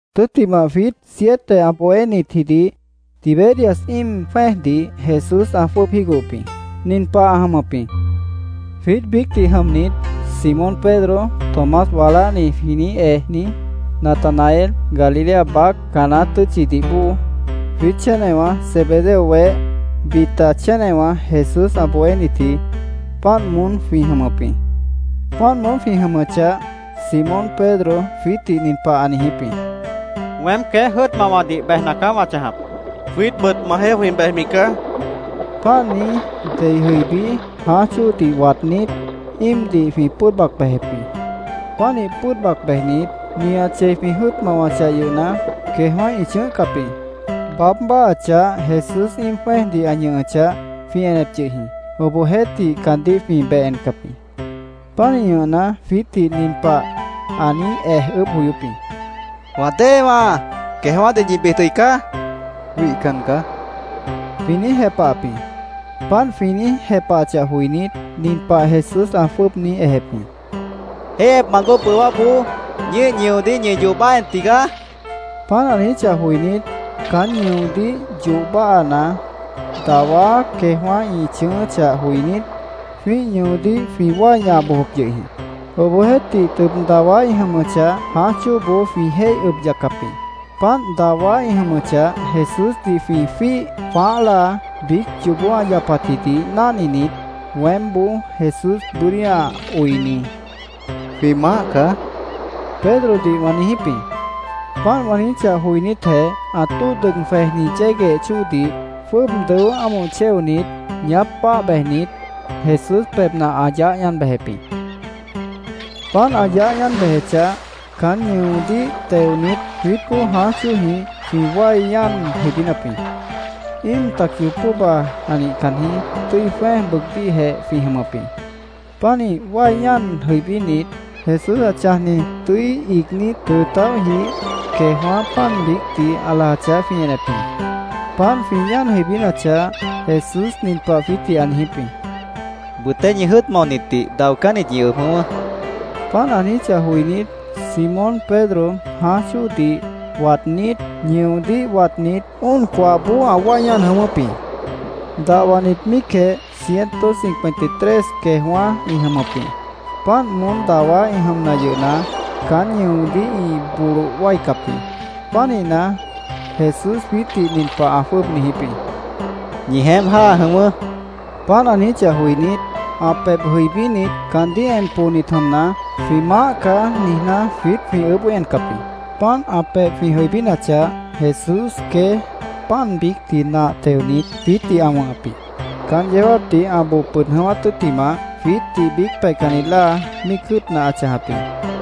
Tʉ́ttimah, jwiít siete ã bohénitjidih Tiberias íim jwẽ́ejdih Jesús ã jwʉ́ʉb jígohop jĩ. Nin pah ã jʉmʉp jĩ: Jwiít biícdih jʉmnit, Simón Pedro, Tomás “Waláhni”, jwĩ niíj ejni, Natanael Galilea baác Caná tʉ́tchidih bóo, jwiít chénewã Zebedeo weh, bita chénewã Jesús ã bohénitji, páant moón jwĩ jʉmʉp jĩ. Páant moón jwĩ jʉmʉchah, Simón Pedro jwiítdih nin pah ã niijíp jĩ: —Weém queéj jʉ́ʉt mawadih bejna caá wã chãjap, ã niijíp jĩ. —Jwiítbʉt majeéh jwĩ bejmi caá, jwĩ niijíp jĩ. Páant niíj, dei jʉibí, jãáj chóodih waadnít, íimdih jwĩ pʉ́ʉd bac bejep jĩ. Pánih pʉ́ʉd bac bejnit, nihat chei jwĩ jʉ́ʉt mawachah yʉhna, queejwã́ ĩ chʉ̃ʉ́hcap jĩ. Baáb báahachah, Jesús íim jwẽ́ejdih ã ñʉhʉchah, jwĩ enep yʉh jĩ. Obohjeéhtih, caandíh jwĩ beh encap jĩ. Pánih ñʉhna, jwiítdih nin pah ã niíj ej ʉʉ́bh joyóp jĩ: —¿Wã déewãá, queejwã́dih ñi bid jʉicá? ã niijíp jĩ. —Wihcan caá, jwĩ niíj jepahap jĩ. Páant jwĩ niíj jepahachah joinít, nin pah Jesús ã jwʉ́ʉb niíj ejep jĩ: —Jéihyepmant bóo bʉwáboó ñíih ñʉodíh ñi yoh báaha en tigaá, ã niijíp jĩ. Páant ã niijíchah joinít, caán ñʉodíh yoh báahana, dawá queejwã́ ĩ chʉ̃ʉ́ʉ́chah joinít, jwĩ́ih ñʉodíh jwĩ wái ñaha bojop yʉh jĩ. Obohjeéhtih, tʉb dawá ĩ jʉmʉchah, jãáj chóoboó jwĩ jéih ʉb yaccap jĩ. Páant dawá ĩ jʉmʉchah, Jesúsdih jwĩ jwíih jwãáh láa biíc yoobó ã yapatjidih náhninit, weémboó, Jesús bʉ́dí ã oini, —Jwĩ Maáh caá, Pedrodih wã niijíp jĩ. Páant wã niijíchah joinítjeh, ã tóo dʉg jwejni yégueh chóodih jwʉ́ʉb dʉó ámoh chéonit, ñaáp báah bejnit, Jesús pebhna ã yaáh ñáan bejep jĩ. Páant ã yaáh ñáan bejechah, caán ñʉodíh teonit, jwiítboó jãáj chóojĩh jwĩ wái ñáan jʉibínap jĩ. Íim tac yoob póhba ã nihcan jĩí, tʉ́i jwẽ́ej bʉʉgdíhjeh jwĩ jʉmʉp jĩ. Pánih wái ñáan jʉibínit, Jesús ã chãjni tʉ́i iigní tʉʉ tãóhjih queejwã́ pan biícdih ã lajachah, jwĩ enep jĩ. Páant jwĩ ñáan jʉibínachah, Jesús nin pah jwiítdih ã niijíp jĩ: —Bʉtéh ñi jʉ́ʉt maonitdih daocánnit ñi ʉb jʉ̃ʉ́wʉ́, ã niijíp jĩ. Páant ã niijíchah joinít, Simón Pedro jãáj chóodih waadnít, ñʉodíh watnit, óon coahboó ã wái ñáan jʉ̃ʉ́wʉ́p jĩ. Dahwanit míicjeh ciento cincuenta y tres queejwã́ ĩ jʉmʉp jĩ. Páant moón dawá ĩ jʉmna yʉhna, caán ñʉodíh ĩ boloh wáicap jĩ. Pánihna, Jesús jwiítdih nin pah ã jwʉ́ʉb niijíp jĩ: —Ñi jeémp jáa jʉ̃ʉ́wʉ́, ã niijíp jĩ. Páant ã niijíchah joinít, ã pebh jʉibínit, caandíh en poonit jʉmna, “Jwĩ Maáh caá”, niijná, jwiít jwĩ ʉʉ́bh joí encap jĩ. Páant ã pebh jwĩ jʉibínachah, Jesús queéj pan biícdih nah teonit, jwiítdih ã wʉ̃hʉp jĩ. Caán yeó jáapdih ã boo pʉd jʉ̃ʉ́wát tʉ́ttimah, jwiítdih biíc peihcanni láa míic jʉ́ʉtna ã chãjap jĩ.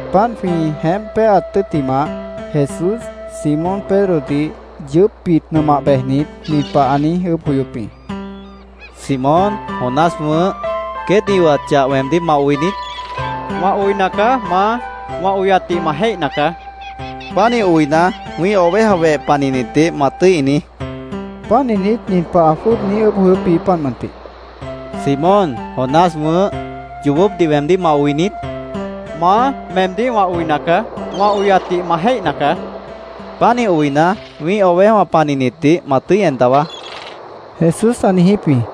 Páant jwĩ jeémp péaat tʉ́ttimah, Jesús Simón Pedrodih yʉʉ́pbit nʉmah bejnit, nin pah ã niíj ʉʉ́bh joyóp jĩ: —Simón, Jonás wʉ̃ʉ́h, ¿queét ĩ oyat chah weemdíh ma oi niít? ã niijíp jĩ. —Wã oina caá, Maá. Wã oyatdih ma jéihna caá, ã niíj jepahap jĩ. —Pánih oina, wĩ́ih oveja weh panihnitdih ma tʉ́i inií, Jesús caandíh ã niijíp jĩ. Páant niijnít, nin pah ã jwʉ́ʉb niíj ʉʉ́bh joyóp jĩ, páant mʉntih: —Simón, Jonás wʉ̃ʉ́h, ¿yoobópdih weemdíh ma oi niít? ã niijíp jĩ. —Maá, meemdíh wã oina caá. Wã oyatdih ma jéihna caá, ã niíj jepahap jĩ. —Pánih oina, wĩ́ih ovejawã panihnitdih ma tʉ́i en dawaá, Jesús ã niijíp jĩ.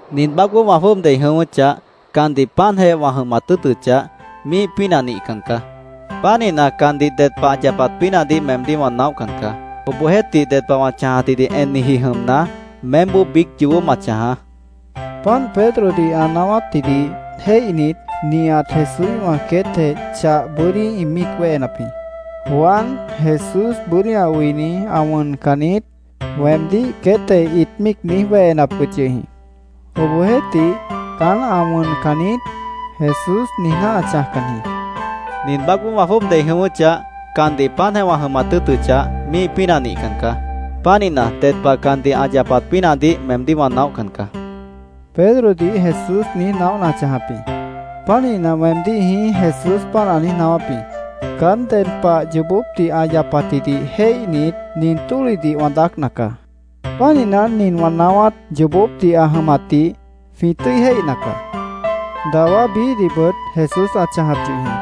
—Nin baácboó wã jwʉ́ʉb dei jʉ̃ʉ́wʉ́chah, candih páantjeh wã jʉmat tʉ́ʉtʉchah, míih pínah nihcan caá. Pánihna, candih ded pah ã yapat pínahdih meemdíh wã naóhcan caá. Obohjeéhtih, ded pah wã chãjatjidih enniji jʉmna, meémboó biíc yoobó ma chãjaá, Jesús Pedrodih ã niijíp jĩ. Páant Pedrodih ã naáwátjidih jéihnit, nihat Jesúíhwã queétjeh chah bʉ́dí ĩt míic wéhenap jĩ. “Juan, Jesús bʉ́dí ã oini, ã wʉncan niít”, weemdíh queétjeh ĩt niíj míic wéhenap yʉh jĩ. Obohjeéhtih, “Caán ã wʉncan niít”, Jesús niijná ã chãjcan jĩ. “Nin baácboó wã jwʉ́ʉb dei jʉ̃ʉ́wʉ́chah, candih páantjeh wã jʉmat tʉ́ʉtʉchah, míih pínah nihcan caá. Pánihna, ded pah candih ã yapat pínahdih meemdíh wã naóhcan caá”, Pedrodih Jesús niíj naóhna ã chãjap jĩ. Pánihna, weemdíh jĩí, Jesús páant ã niíj naáwáp jĩ. Caán ded pah yoobópdih ã yapatjidih jéihnit, nin tólihdih wã daácna caá. Pánihna, nin wã naáwát yoobópdih ã jʉmatdih jwĩ tʉ́i jéihna caá. Dawá biíhdihbʉt Jesús ã chãjap yʉh jĩ.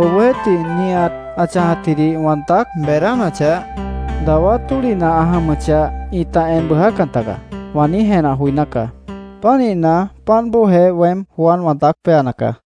Obohjeéhtih, “nihat ã chãjatjidih wã daác beedánachah, dawá tólihna ã jʉmʉchah, ĩta en bʉʉjácan tagaá”, wã niíj jenah joiná caá. Pánihna, páant bóojeh weém Juan wã daác péana caá.